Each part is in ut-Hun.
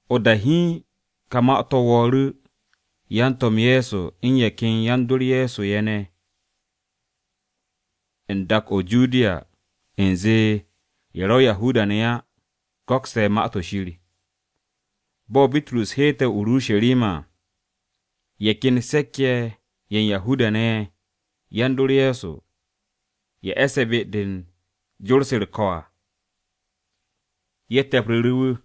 O-da hiin ka ma-to̱ wo̱o̱ru̱ yan-To̱m Ye̱so u̱n ye̱ ken yan-dor Ye̱so ye̱ ne̱ u̱n dak-o̱ o-Judiya u̱nze ye̱ ro̱ Yahuda-ne̱ á go̱kste̱ Ma-to̱ Shir. Bo̱ Bitrus heete̱ o-Urusharima à, ye̱ ken se̱k-ye̱ ye̱ u̱n Yahuda-ne̱ ye̱ yan-dor Ye̱so, ye̱ e̱se̱ be-de u̱n jor-se u̱r-ko̱ à, ye̱ te̱pru̱ru̱ wu̱.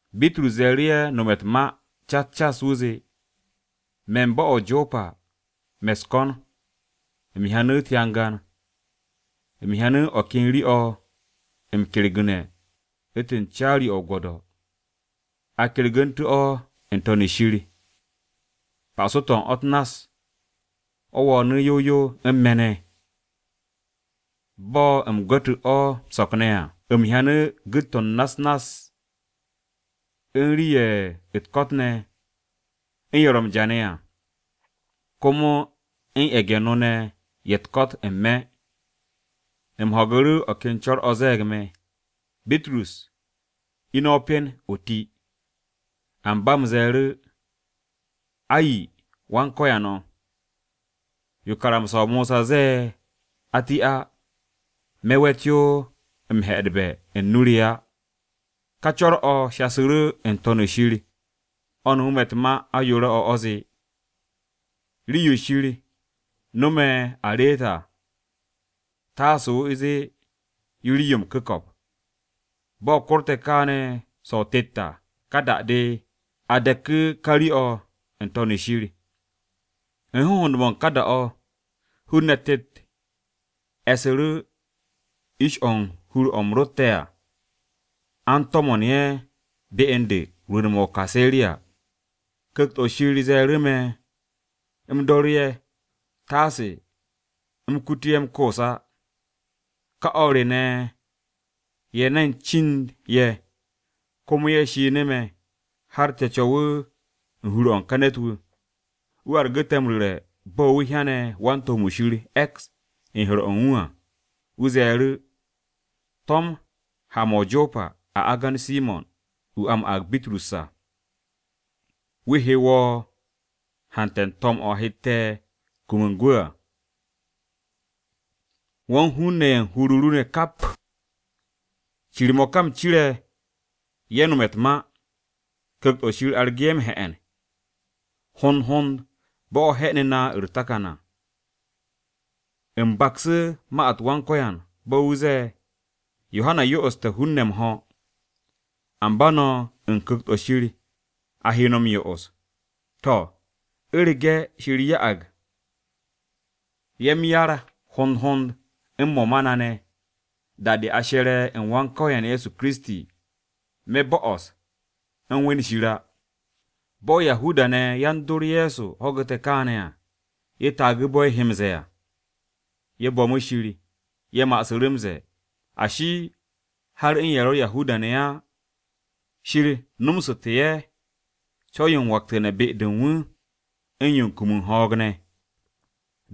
Bitrus ciru̱ ye̱ nome̱ u̱t-ma cas cas, wu̱ zee: “Me̱ u̱n bo̱-o̱ o-Jopa me̱ u̱s-ko̱n, u̱m hyanu̱ u̱t-hyangan. U̱m hyanu̱ o̱ ken rii-o̱ m-kyergu̱ne̱ u̱ntu̱n caari-o̱ o-gwo̱do̱. A kyergu̱ntu̱te̱ o̱ n-To̱n shir, pa'aso-to̱ u̱n o̱ u̱t-nass, o̱ wo̱o̱nu̱ yow yow u̱n me̱ ne̱. Bo̱ u̱m gu̱ttu̱ o̱ m-so̱k ne̱ à, u̱m hyanu̱ gu̱t-to̱ u̱n na-u̱s nass, u̱n rii-ye̱ u̱t-ko̱t ne̱, u̱n ye̱ ro̱ m-ja ne̱ à, komo u̱n ye̱ge̱-no ye̱ u̱t-ko̱t ne̱ n-me̱. U̱m ho̱gu̱ru̱ o̱ ken co̱r-o̱ ze̱e̱g me̱, ‘Bitrus, ine̱, o pen, o ti.’ “Amba u̱m ze̱e̱ru̱, ‘Ay! Wan-Ko̱yan o̱, yo karamsa-o Mosa ze̱e̱ a ti á, me̱ we̱t yo m-he̱'e̱dbe̱ u̱n nu re á!’ “Ka co̱r-o̱ shasu̱ru̱ n-To̱n shir o̱ no̱mu̱ u̱t-ma ayoore̱-o̱, o̱ zee, ‘Rii-yo Shir no̱me̱ a reet à, taase o zee yo rii-yo m-ku̱ko̱p.’ Bo̱ korte̱ kaane̱ so̱-o̱ tet à, ka da-de, a deku̱ ka rii-o̱ n-To̱n shir. “U̱n hohond-mo̱ u̱n ka da-o̱, hun-ne̱ tet e̱su̱ru̱ u̱n ish-o̱ u̱n hur-o̱ u̱m rotte̱ à, a u̱n to̱mo̱n ye̱ be u̱n de rwu̱u̱n-mo̱ o-Kaseriya. Ku̱kt-o̱ Shir ze̱e̱ru̱ me̱ u̱m dooru̱ ye̱, taase u̱m kutu ye̱ m-koos á. Kà o̱r re ne̱ ye̱ ne̱n cind ye̱, komo ye̱ shinu̱ me̱, har te̱ co̱wu̱ u̱n hur-o̱ u̱n ka ne̱t-wu̱. Wu̱ argu̱ te̱ m-ru̱re̱ bo̱ wu̱ hyane̱ wan-to̱m-wu̱ Shir e̱ks u̱n hur-o̱ u̱n wu̱ à. Wu̱ ze̱e̱ru̱, ‘To̱m ha-mo̱ o-Jopa a agan Simo̱n, wu̱ a m-aag Bitrus à. Wu̱ he wo̱ hante̱ u̱n to̱m-o̱ o hette̱ kum u̱n gwu̱ à, wo̱ u̱n hun-ne̱ ye̱ u̱n hur-o ru ne̱ kap.’ “Cir-mo̱ ka u̱m cire̱ ye̱ nome̱ u̱t-ma. Ku̱kt-o̱ Shir argu̱ ye̱ m-he̱'e̱n, hond hond bo̱ o̱ he̱'e̱nu̱ na u̱r-takan à. U̱m baksu̱ ma-u̱t Wan-Ko̱yan, bo̱ wu̱ ze̱e̱, ‘Yohana yo'oste̱ hun-ne̱ m-ho̱, amba no̱ u̱n Ku̱kt-o̱ Shir a he no̱ m-yo'os.’ To̱, u̱rege̱ Shir ya'ag ye̱ m-yar hond hond u̱n mo̱ ma na ne̱, da-de a she̱re̱ u̱n Wan-Ko̱yan Ye̱so Kiristi, me̱ bo'os u̱m we̱n Shir á!” Bo̱ Yahuda-ne̱ yan-dor Ye̱so ho̱gu̱te̱ kaane̱ à, ye̱ taagu̱ bo̱ ye̱ he m-ze̱e̱ à, ye̱ bo̱mu̱ Shir. Ye̱ ma'asu̱ru̱ m-ze̱e̱, “Ashi, har u̱n ye̱ ro̱ Yahuda-ne̱ á, Shir nomsu̱te̱ ye̱ co̱w-yo m-waktu̱ne̱ be-de u̱n wu̱ u̱n yo u̱n kum m-ho̱o̱g ne̱.”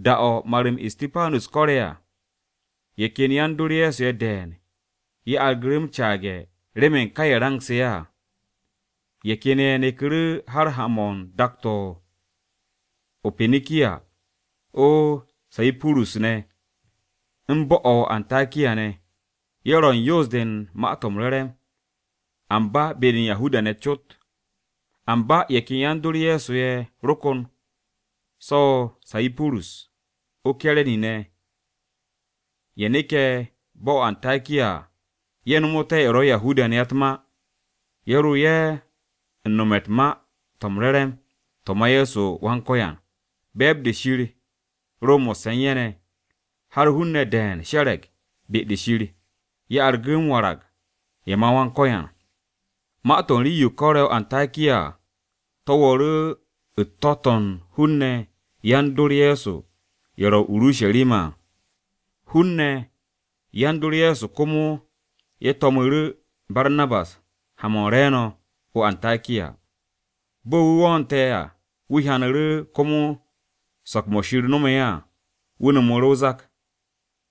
Da-o̱ mar-m Istipanus kore̱ à, ye̱ ken yan-dor Ye̱so ye̱ de̱e̱n ye̱ argu̱ru̱ m-caage̱ remen ka range̱-o̱ ine̱ à. Ye̱ ken ye̱ neku̱ru̱ har ha-mo̱ u̱n dak-to̱ o-Pinikiya o-Sayipurus ne̱, u̱n bo̱-o̱ o-Antakiya ne̱. Ye̱ ro̱ u̱n yoos-de u̱n Ma-to̱ m-Re̱re̱m, amba be-de u̱n Yahuda-ne̱ cot. Amba ye̱ ken yan-dor Ye̱so ye̱ ro kon so̱ o-Sayipurus, o-Kire̱ni ne̱, ye̱ neke̱ bo̱-o̱ o-Antakiya ye̱ nomote̱ ye̱ ro̱ Yahuda-ne̱ á u̱t-ma, ye̱ ro ye̱ u̱n nome̱ u̱n Ma-to̱ m-Re̱re̱m to̱ ma Ye̱so Wan-Ko̱yan. Be̱e̱b-de Shir ro mo̱sse̱ u̱n ye̱ ne̱, har hun-ne̱ de̱e̱n she̱re̱g be-de Shir. Ye̱ argu̱ m-warag ye̱ ma Wan-Ko̱yan. Ma-to̱ u̱n rii-yo ko̱re̱ o-Antakiya à, to̱ wo̱o̱ru̱ u̱n to̱-to̱ u̱n hun-ne̱ yan-dor Ye̱so ye̱ ro o-Urusharima à. Hun-ne̱ yan-dor Ye̱so komo ye̱ to̱mu̱ru̱ Barnabas ha-mo̱ u̱n re̱e̱no̱ o-Antakiya. Bo̱ wu̱ wo̱o̱nte̱ à, wu̱ hyanu̱ru̱ komo so̱k-mo̱ Shir nomo ye̱ à. Wu̱ no̱mu̱ru̱ o-zak.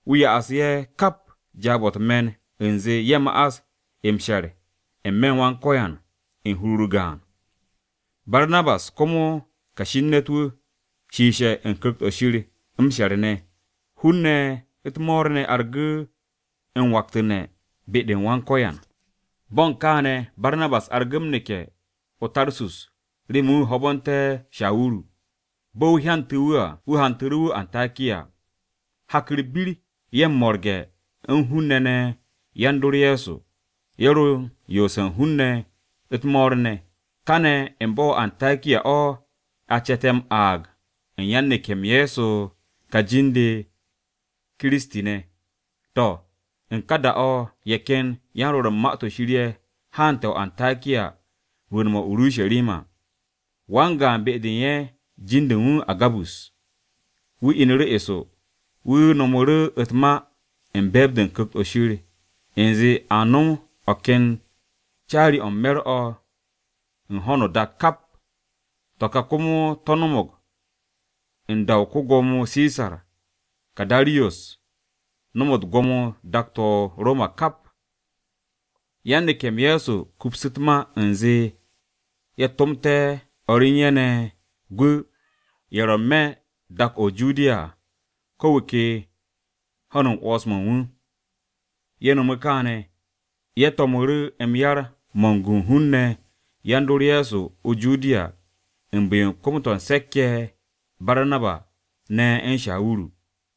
Wu̱ doo ye̱ kap jaab-o̱ u̱t-me̱n u̱nze ye̱ ma'as m-she̱r ne̱ n-me̱ u̱n Wan-Ko̱yan u̱n hur-u̱r gaan. Barnabas komo kashi u̱n ne̱t-wu̱, shiishe̱ u̱n Ku̱kt-o̱ Shir m-she̱r ne̱. Hun-ne̱ u̱t-mo̱o̱r ne̱ argu̱ m-waktu̱ne̱ be-u̱r Wan-Ko̱yan. Bo̱ u̱n kane̱ Barnabas argu̱ m-neke̱ o-Tarsus remen wu̱ ho̱bo̱nté̱ Shawuru. Bo̱ wu̱ hyantu̱ wu̱ à, wu̱ hantu̱ru̱ wu̱ o-Antakiya. Hak u̱r-bir, ye̱ m-mo̱rge̱ u̱n hun-ne̱ ne̱ yan-dor Ye̱so, ye̱ ro u̱n yoose̱ u̱n hun-ne̱ u̱t-mo̱o̱r ne̱. Kaane̱ u̱n bo̱-o o-Antakiya o̱ a ce̱te̱ m-aag u̱n yan-neke̱-m Ye̱so u̱n ka jin-de “Kiristi-ne̱.” To̱, u̱n ka da-o̱ ye̱ ken yan-rwo̱r u̱n Ma-to̱ Shir ye̱ haante̱ o-Antakiya rwu̱u̱n-mo̱ o-Urusharima. Wan-gaan be-de u̱n ye̱, jin-de u̱n wu̱ Agabus, wu̱ inu̱ru̱ eso. Wu̱ no̱mu̱ru̱ u̱t-ma u̱n be̱e̱b-de o-Ku̱kt u̱nze a nom o̱ ken caari-o̱ u̱n me̱r-o̱ u̱n ho̱no o-dak kap (To̱ ka komo to̱ no̱mo̱g u̱n da-o̱ ko-Gwo̱mo Sisar Karadiyos no̱me̱ gwo̱mo-to̱ u̱n dak-to̱ o-Roma kap à). Yan-neke̱-m Ye̱so kupsu̱ u̱t-ma u̱nze ye̱ tomte̱ o̱r re u̱n ye̱ ne̱ gwu̱ ye̱ ro̱ n-me̱ dak-o̱ o-Judiya à, ko̱ wu̱ ke ho̱n u̱n 'wo̱ns-mo̱ u̱n wu̱. Ye̱ no̱mu̱ kaane̱, ye̱ to̱mu̱ru̱ yar-mo̱ m-gu u̱n hun-ne̱ yan-dor Ye̱so o-Judiya u̱n bu̱-yo u̱n kom-u̱t se̱k-ye̱ Barnabas ne̱ u̱n Shawuru.